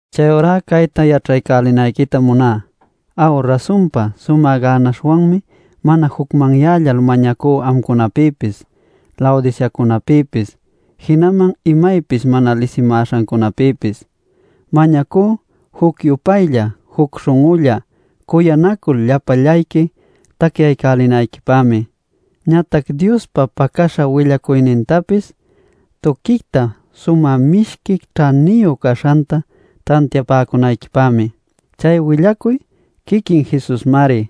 Chayurá cayta yaćhaycälinayquitam muná. Aw, rasunpa sumä gänaśhwanmi mana jucmanyällal mañacú amcunapïpis, Laodiceacunäpïpis, jinaman imaypis mana lisimäśhancunäpïpis. Mañacú juc-yupaylla, juc śhun'ulla cuyanacul, llapallayqui tacyaycälinayquipämi, ñatac Diospa pacäśha willacuynintapis tuquicta sumä mishqui ćhaniyu caśhanta tantiapäcunayquipämi. Chay willacuy quiquin Jesusmari.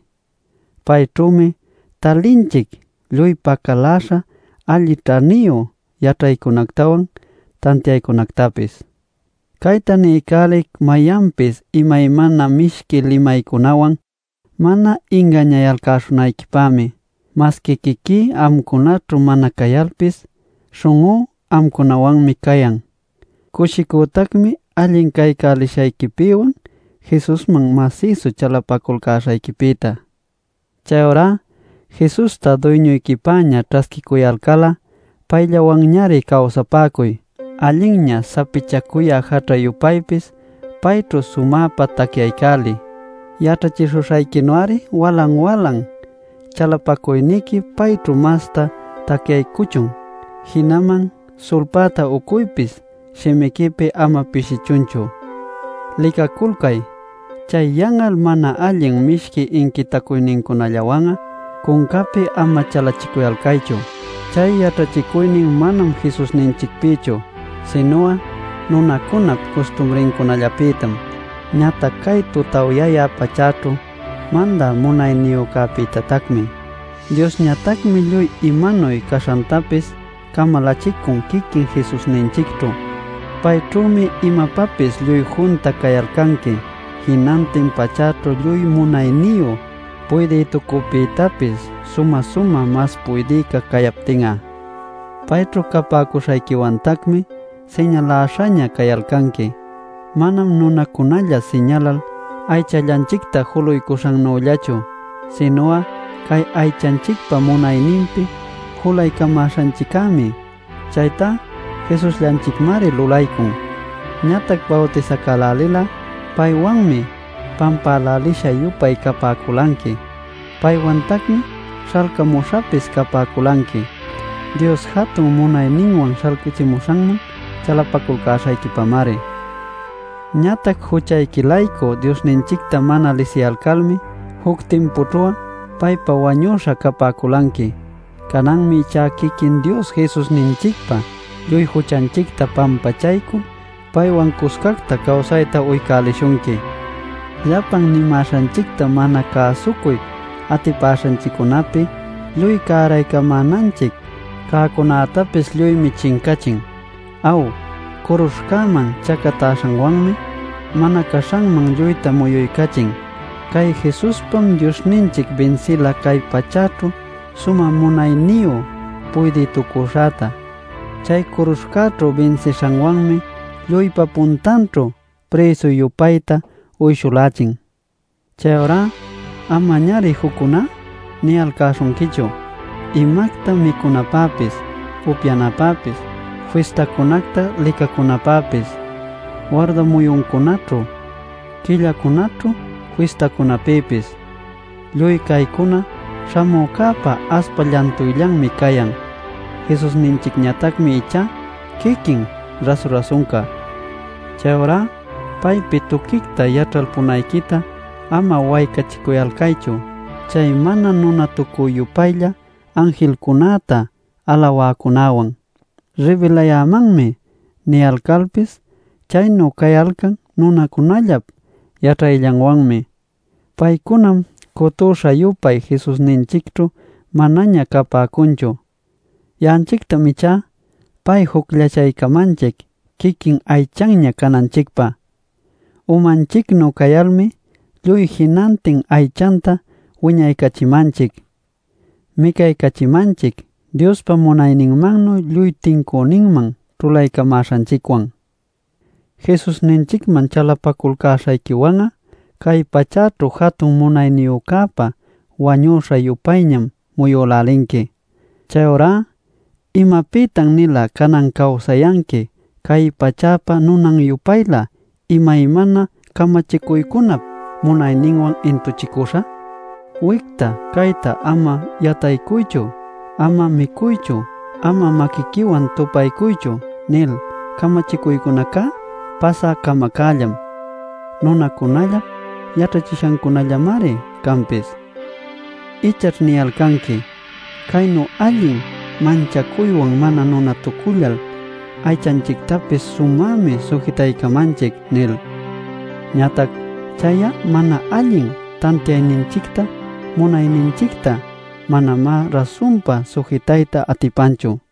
Payćhümi talinchic lluy pacaläśha alli ćhaniyu yaćhaycunactawan tantiaycunactapis. Cayta niycälic mayanpis imaymana mishqui limaycunawan mana ingañayalcäśhunayquipämi. Masqui quiquí amcunaćhu mana cayalpis, śhun'ú amcunawanmi cayan. Cushicütacmi allin caycälishayquipïwan Jesusman masïsu chalapaculcäśhayquipïta. Chayurá Jesusta duyñuyquipäña ćhasquicuyalcal'a payllawanñari cawsapäcuy. Allinña sapichacuyä jaćha-yupaypis payćhu sumäpa tacyaycäliy; yaćhachishuśhayquinu-ari walan-walan chalapacuyniqui payćhu masta tacyaycuchun. Jinaman sulpäta ucuypis shimiquipi ama pishichunchu. Licaculcay; chay yan'al mana allin mishqui inquitacuynincunallawan'a cuncapi ama chalachicuyalcaychu. Chay yaćhachicuynin manam Jesusninchicpïchu, sinu'a nunacunap custumrillancunapïtam, ñatac cay tutawyayä pachäćhu mandä munayniyücäpïtatacmi. Diosñatacmi lluy imanuy caśhantapis camalächicun quiquin Jesusninchicćhu. Payćhümi imapapis lluy junta cayalcanqui, jinantin pachäćhu lluy munayniyu puydïtucüpïtapis sumä-sumä mas puydïca cayaptin'a. Payćhu capäcuśhayquiwantacmi siñaläśhaña cayalcanqui. Manam nunacunalla siñalal aychallanchicta juluycuśhannüllachu, sinu'a cay aychanchicpa munayninpi julaycamäśhanchiccämi; chaytá Jesusllanchicmari lulaycun. Ñatac bawtisacälälil'a paywanmi pampälälisha-yupay capäculanqui; paywantacmi śhalcämuśhapis capäculanqui, Dios jatun munayninwan śhalcachimuśhanman chalapaculcäśhayquipamari. Ñatac juchayqui-laycu Diosninchicta mana lisiyalcalmi juc timpućhu'a paypä wañüśha capäculanqui. Cananmi ichá quiquin Dios Jesusninchicpa lluy juchanchicta pampachaycul paywan cuscacta cawsayta uycälishunqui. Llapan nimäśhanchicta mana cäsucuy atipaśhanchiccunäpi lluy cäraycamänanchic cäcunätapis lluymi chincachin. Aw, curuśhcäman chacatäśhanwanmi mana caśhanman lluyta muyuycachin. Cay Jesuspam Diosninchic binsila cay pachäćhu sumä munayniyu puydïtucuśhäta. Chay curuśhcäćhu binsishanwanmi lluypa puntanćhu prïsu-yupayta uyshulächin. Chayurá amañari juccuná niyalcäśhunquichu, imacta micunapäpis, upyanapäpis, fistacunacta licacunapäpis, warda muyuncunaćhu, quillacunaćhu fistacunapïpis. Lluy caycuna śhamücäpa aspa llantuyllanmi cayan. Jesusninchicñatacmi ichá quiquin rasu-rasunca. Chayurá paypi tuquicta yaćhalpunayquita ama waycachiculcaychu chay mana nunatucü-yupaylla anjilcunäta alawäcunäwan. “Ribilayämanmi” niyalcalpis chaynu cayalcan nunacunallap yaćhayllanwanmi. Paycunam cutüśha-yupay Jesusninchicćhu manaña capäcunchu. Ya'anchictam ichá, pay jucllachaycamanchic quiquin aychanña cananchicpä. Umanchicnu cayalmi, lluy jinantin aychanta wiñaycachimanchic, micaycachimanchic, Diospa munayninmannuy lluy tincüninman ćhulaycamäśhanchicwan. Jesusninchicman chalapaculcäśhayquiwan'a cay pachäćhu jatun munayniyücäpa wañuśha-yupayñam muyülälinqui. Chayurá ¿imapïtan-nila canan cawsayanqui cay pachäpa nunan-yupaylä imaymana camachicuycunap munayninwan intuchicüśha? “Wicta cayta ama yataycuychu, ama micuychu, ama maquiquiwan tupaycuychu” nil camachicuycunacá pasä camacällam; nunacunallap yaćhachishancunallamari canpis. Ichaćh niyalcanqui “Caynu allin manchacuywan mana nunatucullal aychanchictapis sumämi sujitachimanchic” nil. Ñatac chay'a mana allin tantiayninchicta munayninchicta manamá rasunpa sujitayta atipanchu.